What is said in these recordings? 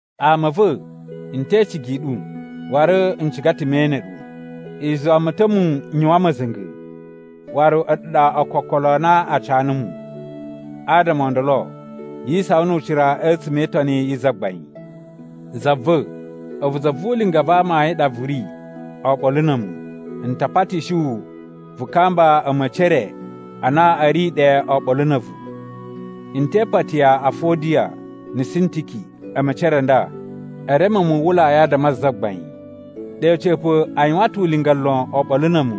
Ama a̱ va̱, n te icigi i ɗu, waru n ciga ta̱ me ene ɗu. I zuwa mu ta̱ mu n yuwan ma̱za̱nga̱ waru a̱ɗu ɗa ookokolo a na a ca numu. Adama o ndolo yi isawan nu ucira a̱tsuma̱ e Itoni yi Zagbain. Za va̱, a̱vu za vu ulinga va amayun ɗa vu ri oɓolo na̱ a̱mu, n ta patishi wu vu kamba a̱ma̱ci e re a na a̱ ri ɗe oɓolo na̱ a̱vu. N te ipati ya Afodiya na̱ Sintiki a̱ma̱ci e re a nda, e reme muwwulai adama a Zagbain. Ɗe a̱ca̱pa̱ a yuwan ta̱ ulinga lon oɓolo na̱ a̱mu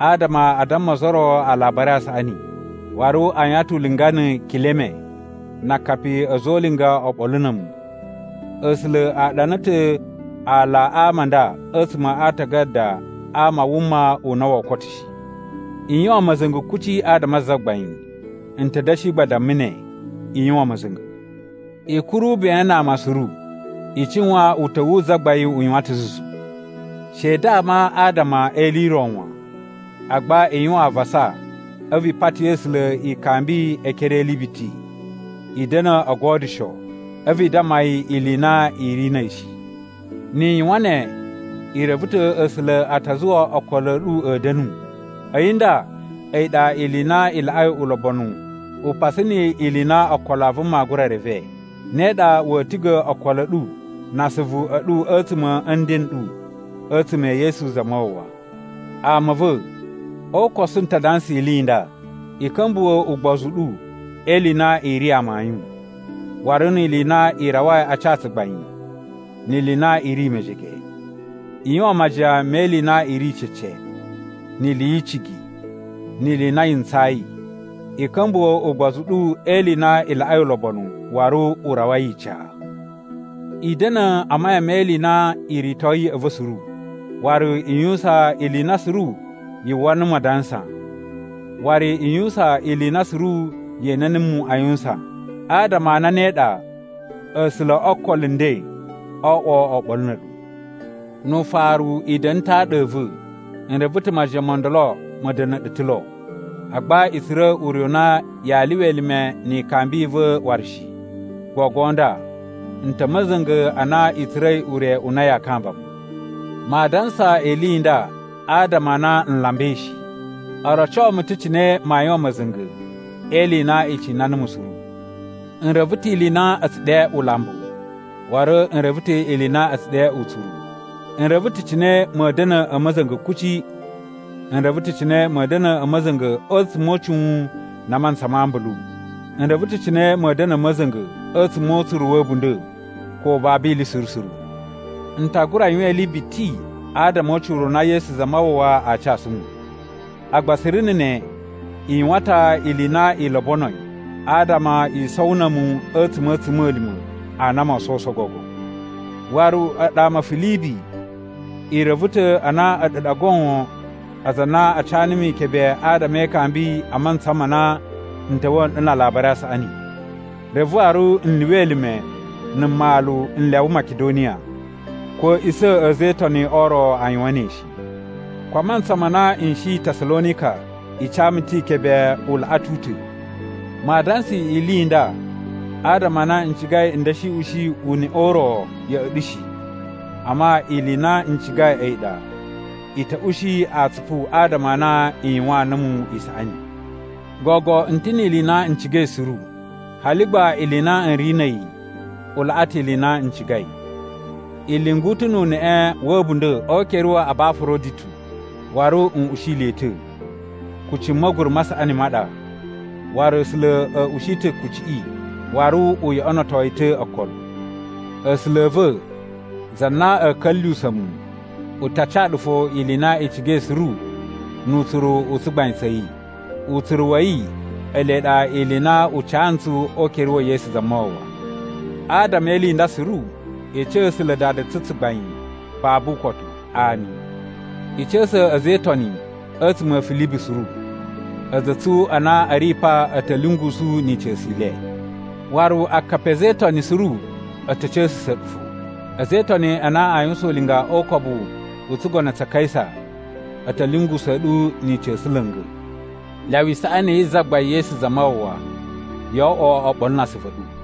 adama a damma ozo o ro Alabari a Saꞌani. Waru a yuwan ta̱ ulinga na̱ Kileme na akapi a̱ a̱za̱ o ulinga oɓolo na̱ a̱mu. A̱sula̱ a ɗana ta̱ ala a ama a nda a̱tsuma̱ a aatagada a ama a wuma u na woo koto shi. I yuwan ma̱za̱nga̱ kuci adama a Zagbain. N ta̱ da̱shi gba damma ne, i yuwan ma̱za̱nga̱! I kuru ben na ama suru, i cuwan uta̱wu wu Zagbain u yuwan ta̱ zuzu. She i dama adama e ili i ro wan. Agba i yuwan avasa a̱vu i pati A̱sula̱ ikambi e ekere e ili biti. I da̱na̱ o godyusho, a̱vu i damma yi ili i na i ri na̱ a̱yi shi. Ni i yuwan ne, i reve ta̱ A̱sula̱ a ta zuwa okolo a̱ ɗu a̱ da̱nu. A̱yi nda a̱yi ɗa ili i na i laꞌai ulobonu upasu ni ili i na ookolo a vuma aa gura reve. Ne ɗa wa̱a̱ tiga̱ okolo a̱ ɗu na asuvu a̱ ɗu a̱tsuma̱ a̱ nden n ɗu a̱tsuma̱ e Yesu Zamawawa. Ama a̱ va̱, o ukosu n ta dansa ili i nda: i ka̱mbuwa̱ ugbozu u ɗu e ili i na i ri amayun, waru ni ili i na i rawai a ca tsugbain ni ili i na i ri mejege. I yuwan majiyan me ili i na i ri cece, ni ili yi icigi, ni ili i na yi ntsayi. I ka̱mbuwa̱ ugbozu u ɗu e ili i na i laꞌai ulobonu waru u rawai ica. I da̱na̱ a mayan me ili i na i ritoi ya̱ꞌa̱ va̱ suru. Waru i yuwusan ili i na suru yu uwwa numu adansa. Waru i yuwusan ili i na suru ye ene numu a yuwusan. Adama a na ne ɗa, A̱sula̱ o okolo nden oo oꞌwo oɓolo na̱ a̱ɗu. Nu ufaru i da̱na̱ ta̱ aɗa a̱ va̱. N reve ta̱ majiyan mo ndolo ma̱ da̱na̱ ɗu ta̱ lo, agba i tsura̱ ure u na yaa lyuwa elime ni ikambi i va̱ waru shi. Gogo nda n ta̱ a̱ ma̱za̱nga̱ a na i tsura̱i ure u na yaa kamba mu. Maa dansa ili i nda adama a na n lambai shi. O roco mu ta̱ cine maa yuwan ma̱za̱nga̱ e ili i na i cina numu suru. N reve ta̱ ili i na a̱ tsu ɗe ulambu. Waru n reve ta̱ ili i na a̱ tsu ɗe utsuru. N reve ta̱ cine ma̱a̱ da̱na̱ a̱ ma̱za̱nga̱ kuci. N reve ta̱ cine ma̱a̱ da̱na̱ a ma̱za̱nga̱ a̱tsuma̱ o ucuwun na a mantsa ma ambulu. N reve ta̱ cine ma̱a̱ da̱na̱ a̱ ma̱za̱nga̱ a̱tsuma̱ o utsuru wa̱ a̱bunda̱, ko babu ili suru suru. N ta gura yuwan ili biti adama o ucira u na Yesu Zamawawa aa casu mu. Agba suru na̱ ne, i yuwan ta̱ ili i na i lobonoi adama i sowo na̱ a̱mu a̱tsuma̱ a̱ a̱tsuma̱lima̱ a na moo sowuso gogo. Waru a̱ɗu ama a̱ Filibi i reve ta̱ a na a̱ɗu ɗa goon aza a na a ca numu ikebe adama e ikambi a mantsa ma na n ta̱wa̱a̱ nɗu na Alabari a Saꞌani, reve waru n lyuwa elime na̱ mmalu n lyawa Makidoniya. Ko a̱a̱ꞌisa̱ a̱ a̱za̱ e Itoni o ro a yuwan ne shi. Ko a mantsa ma na n shi Tasalonika i ca mu ta̱ ikebe u laꞌa ta̱ u ta̱. Maa dansa ili i nda adama a na n cigai n da̱shi ushi uneꞌe u ro ya̱ꞌa̱ ɗu shi. Amma ili i na n cigai a̱yi ɗa i ta̱ ushi atsupu adama a na i yuwaan numu isaꞌani. Gogo n ta̱ ni ili i na n cigai suru. Hali gba ili i na n ri na̱ a̱yi u laꞌa ta̱ ili i na n cigai. I lyungu ta̱ nu uneꞌe wa̱ a̱bunda̱ o ukere wa̱ Abafaroditu, waru n ushi le ta̱. Kucci ma̱guru ma saꞌani ma ɗa, waru A̱sula̱ a̱ ushi ta̱ kucciꞌi waru u yoꞌonoto yi ta̱ okolo. A̱sula̱ a̱ va̱, za na a̱a̱ ka̱lyuwusa̱ mu, u ta ca ɗu fo ili i na i cigai suru nu utsuru u tsugbain tsa̱ yi. Utsuru wa̱ yi ele ɗa ili i na u ca ntsu o ukere wa̱ Yesu Zamawawa. Adama e ili i nda suru, i ca A̱sula̱ Dada tsu tsugbain babu ukotu. Ami. I ca̱sa̱ a̱za̱ e Itoni a̱tsuma̱ a̱ Filibi suru. A̱za̱ a̱ tsu a na a̱ ri pa a̱ ta̱ lyungusu ni ica̱su i le. Waru akapi a̱ a̱za̱ e Itoni suru a̱ ta̱ ca̱sa̱sa̱ ɗu fo. A̱za̱ e Itoni a na aa yuwusan ulinga o ukobu u tsugono tsa̱ Kaisa a̱ ta̱ lyungusa̱a̱ ɗu ni ica̱su la̱nga̱. Lyawa isaꞌani yi Zagbain Yesu Zamawawa yo oꞌwo oɓolo na asuvu a̱ ɗu.